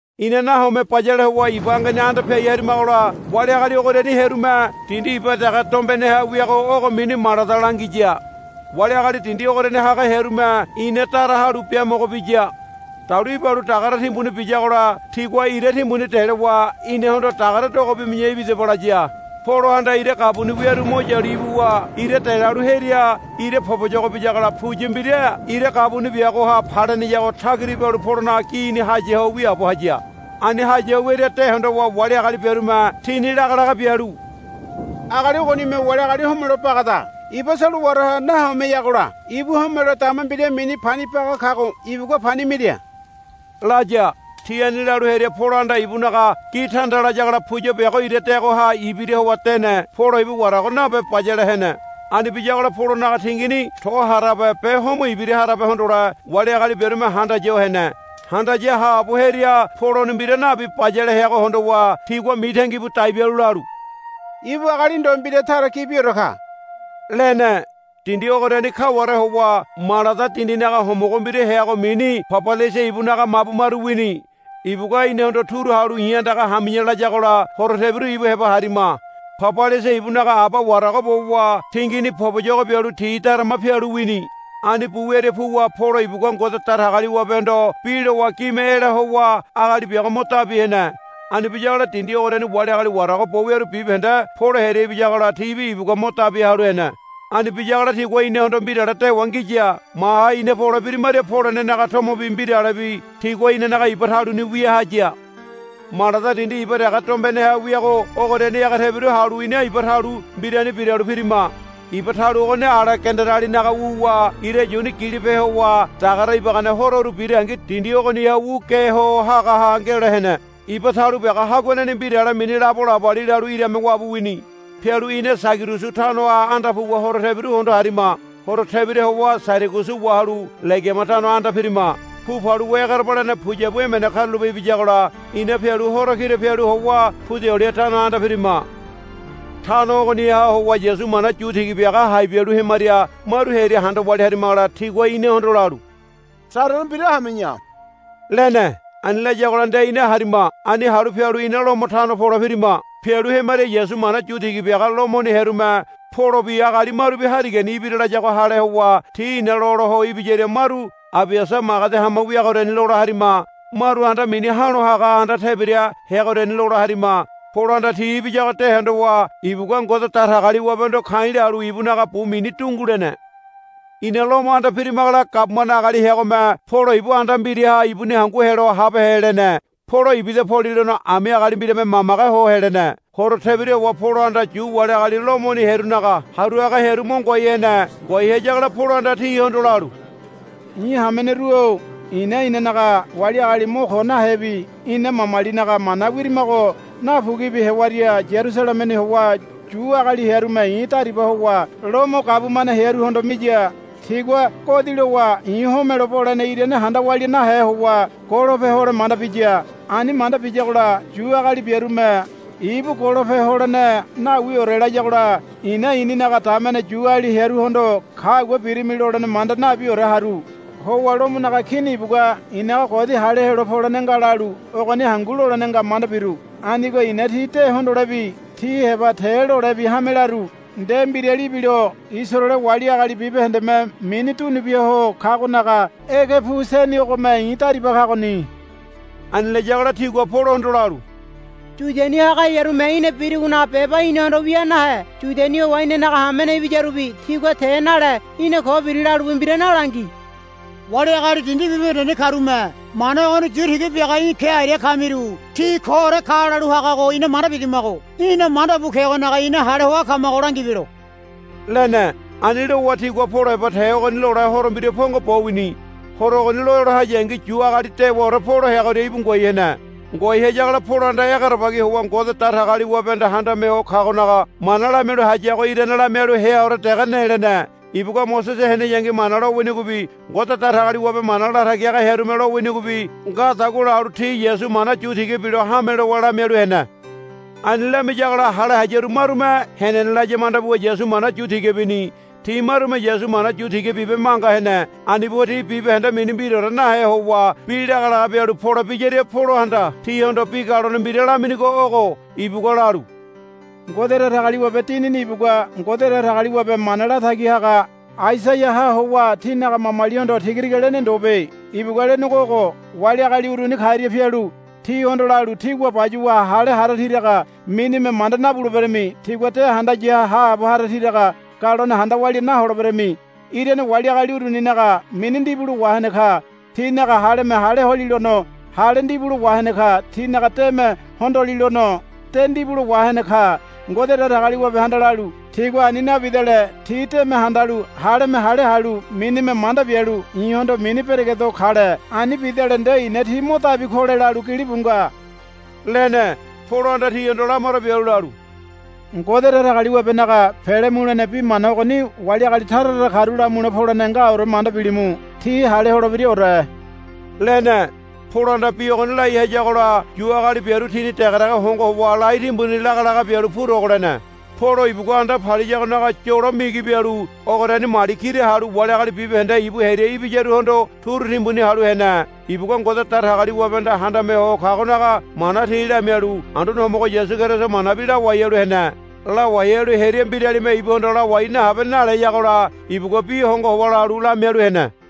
Ina nahome bayale howa iba angeni anda piai harimagola wali agali ogoriani hearume, Dindi iba dege dombeneha wiago ogo mini Malada, langiya. Wali agali dindi ogoriani haga hearume ina dara halu biamogo biya. Dalu ibalu dagare timbuni biyagola tigua ira timbuni delowa inahondo, Dagare dogo bimi̱ya ibidaba, laya. Polohanda ira gabuni wiaru mo yalu ibuwa ira delalu hearia ira poboyogo biyagola puya mbira ira gabuni biagoha paleneyago tagira ibalu Polonaga gini haya ho wiaabo haya. Ani haya ho wiaria de hondowa wali agali biarume tini lagalaga bialu, Agali ogonime wali agali homelo bagada. Iba solowaraha nahomeyagola ibu homelo dama mbira mini Pani Baga kago ibugua pani mira, laya. Ti ani lalu hearia Polohanda ibunaga gi tanda layagola puya biago ira deagoha ibira howa dene. Polo ibu warago nabe bayale hene. Ani biyagola Polonaga tingini to harabe be homo ibira harabe hondole wali agali biarume handaya ho hene. Handaya haabo hearia Poloni mbira nabi bayale heago hondowa tigua mitangi budai bialu lalu, Ibu agali ndo mbira tara gibiore ka, lene. Dindi ogoriani kaware howa Malada dindinaga homogo mbira heago mini Pabaliasa ibunaga mabu maru wini. Ibugua inahondo turu halu, I̱ andaga hami̱ya, layagola horo tebiru ibu heba harima. Pabaliasa ibunaga aba warago bowa tingini poboyogo bialu ti darama pialu wini. Ani bu wiaria puwa Polo ibugua Ngode Datagaliwabehondo bi lowa gime ela howa agali biago mo dabi hene. Ani biyagola dindi ogoriani wali agali warago bo wiaru bibahende Polo hearia ibiyagola tibi ibugua mo dabi halu hene. Ani biyagola tigua inahondo mbirale dewa ngiya. Maha ina pole birimaria polenenaga tomobi mbiralebi tigua inanaga iba taluni wia haya. Malada dindi iba dege dombeneha wiago ogoriani ege tebira halu ina iba talu mbirani biralu pirima. Iba talu ogoni Alegandarialinaga wuwa ira yuni gilope howa dagare ibagane hororu birangi dindi ogoniha wu ge ho hagaha ngelo hene. Iba talu biago haguaneni mbirale mini Labo Laboli lalu irame wabu wini. Pialu ina Sairagusu tanoha anda puwa horo tebiru hondo harima. Horo tebira howa Sairagusu wahalu Legiama tano anda pirima. Pu paluwa egerebalene puyabu emene karulape ibiyagola ina pialu horo kira pialu howa Pudioli tano anda pirima. Tano ogoniha howa Yasu mana yu tiga biaga hai bialu hemaria maru hearia handa walia harimagola tigua inahondo lalu, Sarere mbira hami̱ya, lene. Ani layagola nde ina harima. Ani halu pialu ina Lomo tano pole pirima. Pialu hemaria Yasu mana yu tiga biaga Lomoni hearume, Polobi agali marubi harigani ibira, layago hale howa ti ina lola ho ibiyaria maru Abiasa magedi hama wiagoriani lola harima. Maru anda mini Ha̱lo Haga Anda Tebira heagoriani lola harima. Polohanda ti ibiyago de hondowa ibugua Ngode Datagaliwabehondo ka̱i̱ lalu ibunaga bu mini dungu lene. Ina Lomo anda pirimagola gabumane agali heagome, Polo ibu anda mbiraha ibuni hangu helo habehe, lene. Polo ibida polilono ami agali mbirame mamage ho helene. Horo tebira howa Polohanda Yu wali agali Lomoni hearunaga haru haga hearu mo ngoai hene. Ngoai hayagola Polohanda tihondo lalu, I̱ hameneru-o i̱na inanaga wali agali mo ko nahebi ina mamalinaga mana wirimago napuguibi hewaria Yarusalememi howa Yu agali hearume i̱ dariba howa Lomo gabumane hearuhondo miya. Tigua godi lowa i̱ homole bolene irane handa walia nahe howa golope hole manda biya. Ani manda biyagola Yu agali biarume, Ibu golope holene nawiore, layagola i̱na i̱ninaga damene Yuali hearuhondo, Kagua birimi, lolene manda nabiore haru. Howa Lomonaga Kini ibugua i̱naga godi hale helo polene nga lalu ogoni hangu lolene nga manda biru. Anigo i̱na tí de hondolebi tí heba te lolebi hame laru. Nde mbirali ibilo Isaraele wali agali bibahendeme mini dunu bia ho kagonaga ege pu seni ogome i̱ dariba kagoni. Ani layagola tigua Polohondo lalu, Yudiani haga hearume í̠na birigonaga beba inahondo wia nahe. Yudiani howa inanaga hamene ibiyarubi tigua te nale í̠na ko biri lalubi mbira nalangi. Wali agali dindi bibahendeni karume, Mana ogoni yu tiga biaga í̠ ke aria kamiru ti koore ka, lalu hagago ina manda bidamago í̠na manda bu kegonaga ina hale hoa kamago langibelo, lene. Ani lowa tigua Polo heba te ogoni lole horo mbira pongo bo wini. Horo ogoni lola hayangi Yu agali dewaore Polo heagoria íbu ngoai hene. Ngoai hayagola Polohanda egerebagi howa Ngode Datagaliwabehanda Handame Ho Kagonaga mana lamialu hayago irane lamialu heaore dege ne lene. Ibugua Mosese heneyangi Mana lowinigobi Ngode Datagaliwabe mana latagi haga hearume lowinigobi ngadagua lalu ti Yasu mana yu tiga bilo hame lowa lamialu hene. Ani lamiyagola hale hayaru marume, Henene laya, manda buwa Yasu mana yu tiga bini. Ti marume Yasu mana yu tiga bibe manga hene. Ani buwa ti bibahende mini mbiraore nahe howa bi lagalaga bialu pole biyaria Polohanda tihondo bi galone mbira laminigo ogo. Ibugua lalu, Ngode Datagaliwabe Dinini ibugua Ngode Datagaliwabe mana latagi haga Aisaiaha howa tínaga mamalihondo tiga tiga lene ndobe. Ibugua lenego ogo, Wali agali uruni karia pialu tihondo lalu, Tígua bayuwa hale hara tiraga minime manda nabuleberami. Tígua de handaya haabo hara tiraga galone handa walia naholeberami. Irane wali agali uruninaga mini ndibulo wahene ka. Tinaga haleme hale holilono hale ndibulo wahene ka. Tinaga deme hondolilono de ndibulo wahene ka. Ngode Datagaliwabehanda lalu, Tigua ani nabidale ti deme handalu haleme hale halu minime manda bialu i̱hondo mini beregedo kale. Ani bidale nde i̱na ti mo dabi kole, lalu gilibu nga, lene. Polohanda tihondo lamaro bialu lalu, Ngode Datagaliwabenaga pele mulene bi mana ogoni wali agali tara tara karu lamule polene ngaore manda bilimu. Ti hale holebiraore, lene. [ Polohanda bi ogoni lai hayagola Yu agali biaru tini degedege hongo howa lai timbuni lagalaga bialu purogo lene.] Polo ibugua anda paliyagonaga yolo migi bialu ogoriani mali kira halu wali agali bibahende ibu hearia ibiyaruhondo turu timbuni halu hene. Ibugua Ngode Datagaliwabehanda Handame Ho Kagonaga mana ti lamialu Anduane Homogo Yasu Keriso manabi lawai halu hene. Lawai halu hearia mbiralime ibuhondo, Lawai nahabe, naleyagola ibugua bi hongo howa lalu lamialu hene.